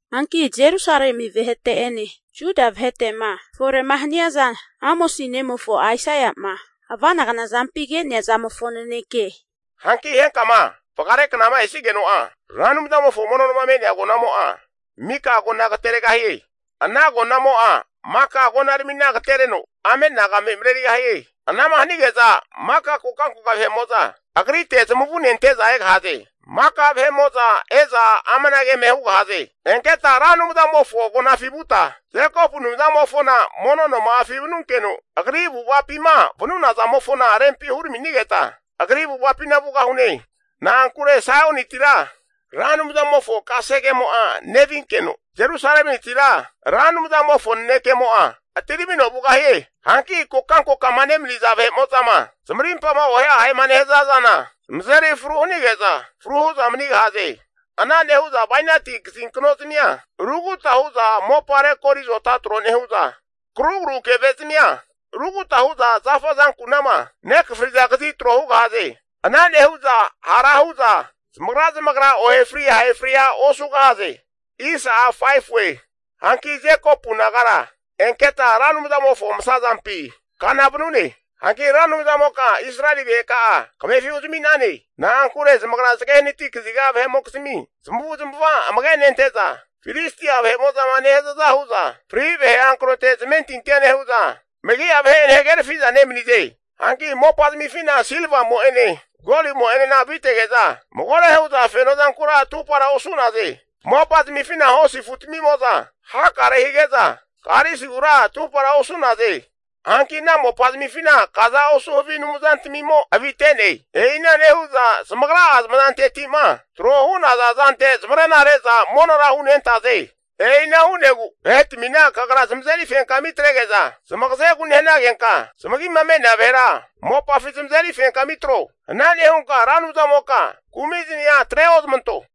Hanki Jerusalemi vahete'ene Juda vahete'ma fore'ma haniaza Amosi nemofo Aisaia'ma ava'nagna zampi ke'nea zamofo naneke. Hanki henkama vagareknama esigeno'a Ra Anumzamofo mono noma me'nea agonamo'a, mika agona agateregahie. Ana agonamo'a maka agonaramina agatereno ame'nagame merarigahie. Anama hanige'za maka kokankoka vahe'mo'za agrite zamavune ante'za egahaze. Maka vahe'mo'za e'za amanage eme hu'za hugahaze, Enketa Ra Anumzamofo agonafi vuta, Jekopu Anumzamofona mono noma'afi vanunkeno, Agri avu'avapima vanuna zamofo avu'ava zana rempi huraminigeta, agri avu'avapina vugahune. Na'ankure Saiontira Ra Anumzamofo kasegemo'a nevinkeno, Jerusalemitira Ra Anumzamofo nanekemo'a atiramino vugahie. Hanki kokankokama nemaniza vahe'mo'zama zamarimpama ohe ahema nehaza zana, zamazeri fru hanige'za fru hu'za manigahaze. Ana nehu'za bainati kazinknozamia rukuta huza mopa rekori azota tro nehu'za, karugru keve zamia ruguta hu'za zafa azankunama nekafriza kazi tro hugahaze. Ana nehu'za hara hu'za zamagra zamagra ohe fri ahe fria osugahaze. Hanki Jekopu nagara enketa Ra Anumzamofo masazampi kana vanune. Hanki Ra Anumzamoka Israeli vaheka'a kamefi huzami'nane. Na'ankure zamagra zage hanati kaziga vahe'mokizmi zamavu'zamava amage nente'za, Filistia vahe'mo'zama nehazaza hu'za fri vahe hankrote zamentintia nehu'za, megi'a vahe'ene hagerafi'za nemanize. Hanki mopa zamifina silvamo'ene golimo'enena avitege'za, magore hu'za feno zankura atupara osu'naze. Mopa zamifina hosi afutamimo'za hakare hazage'za, karisigura atupara osu'naze. Hanki ana mopazamifina kaza osu havi anumzantamimo avite'ne. E'ina nehu'za zamagra'a zamazanteti'ma tro hu'naza zante zamarena re'za monora hunentaze. E'ina hu'negu vahetamina Kagra zamazeri fenkami atrege'za, zamagazegu nehanagenka zamagima me'nea vahera mopafi zamazeri fenkami atro. Ana nehunka Ra Anumzamoka kumizmia atre ozmanto.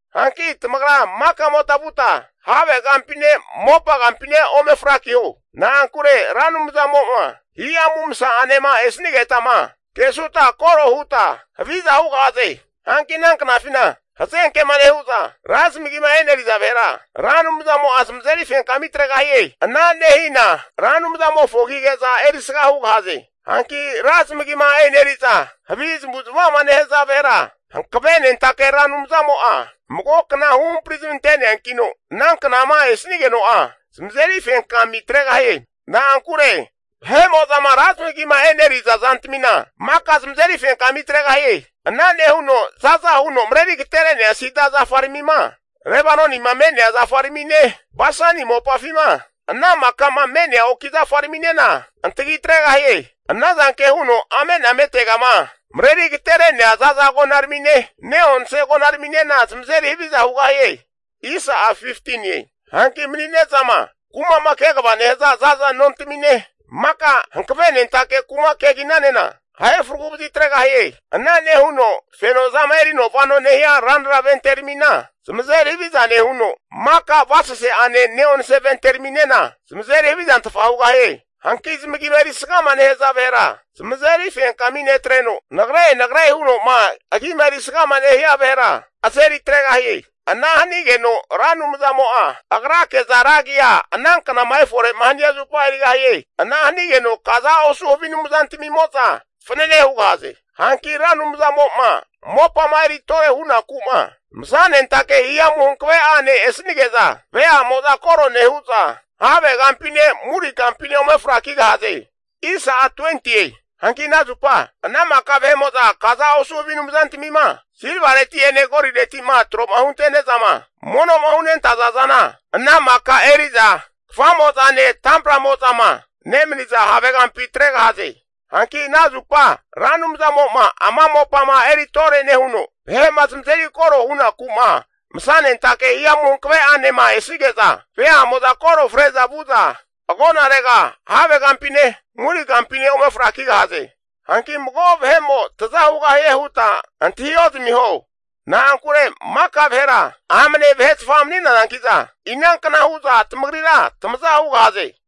Hanki tamagra makamota vuta have kampine, mopa kampine ome frakiho. Na'ankure Ra Anumzamo'ma Hihamu Masa'anema esanigetama kesuta koro huta haviza hugahaze. Hanki ana knafina, hazenkema nehu'za ra zamagima eneriza vahera, Ra Anumzamo'a zamazeri fenkami atregahie. Ana nehina Ra Anumzamofo agige'za erisga hugahaze. Hanki ra zamagima eneri'za havi zamavu zamava'ma nehaza vahera, Hankavenentake Ra Anumzamo'a mago kna huhampari zamante'neankino, ana knama esanigeno'a, zamazeri fenkami atregahie. Na'ankure vahe'mo'zama ra zamigima e'neriza zantamina maka eri fenkami atregahie. Ana nehuno za'za huno mareri agatere'nea sida zafaramima Lebanonima me'nea zafaramine, Basani mopafima ana makama me'nea oki zafaraminena antagi atregahie. Anazanke huno ame'nametegama mareri agatere'nea zaza agonaramine, ne'onse agonaraminena zamazeri haviza hugahie. Hanki mani'nezama kuma'ma kegava nehaza za'za nontamine, maka hankave nentake kuma keginanena ahe fragu vazitregahie. Ana nehuno fenozama erino vano nehia ranra venteramina eri haviza nehuno, maka avasase'ane ne'onse vente raminena zamazeri havizantfa hugahie. Hanki zamagima erisgama nehaza vahera zamazeri fenkami netreno, nagre nagre huno'ma agima erisgama nehia vahera azeri atregahie. Ana hanigeno Ra Anumzamo'a Agrake'za ragia ananknama efore'ma hania zupa erigahie. Ana hanigeno kaza osu havi anumzantamimo'za fanane hugahaze. Hanki Ra Anumzamo'ma mopama eri tore hunaku'ma masanentake hihamu hankave'ane esanige'za, veamo'za koro nehu'za havegampine, muri kampine ome frakigahaze. Hanki ana zupa ana maka vahe'mo'za kaza osu havi anumzantamima silvareti'ene golireti'ma tro'ma huntene'zama mono'ma hunentaza zana, ana maka eri'za kfamozane tampramozama nemaniza havegampi atregahaze. Hanki ana zupa Ra Anumzamo'ma ama mopama eri tore nehuno, vahe'ma zamazeri koro hunaku'ma, masanentake hihamu hankave'anema esanige'za, veamo'za koro fre'za vu'za agonarega havegampine murigampine ome frakigahaze. Hanki mago vahe'mo'a taza hugahie huta antah ozamiho. Na'ankure maka vahera amne vahetfa mani'nazanki'za, inankna hu'za tamagrira tamaza hugahaze?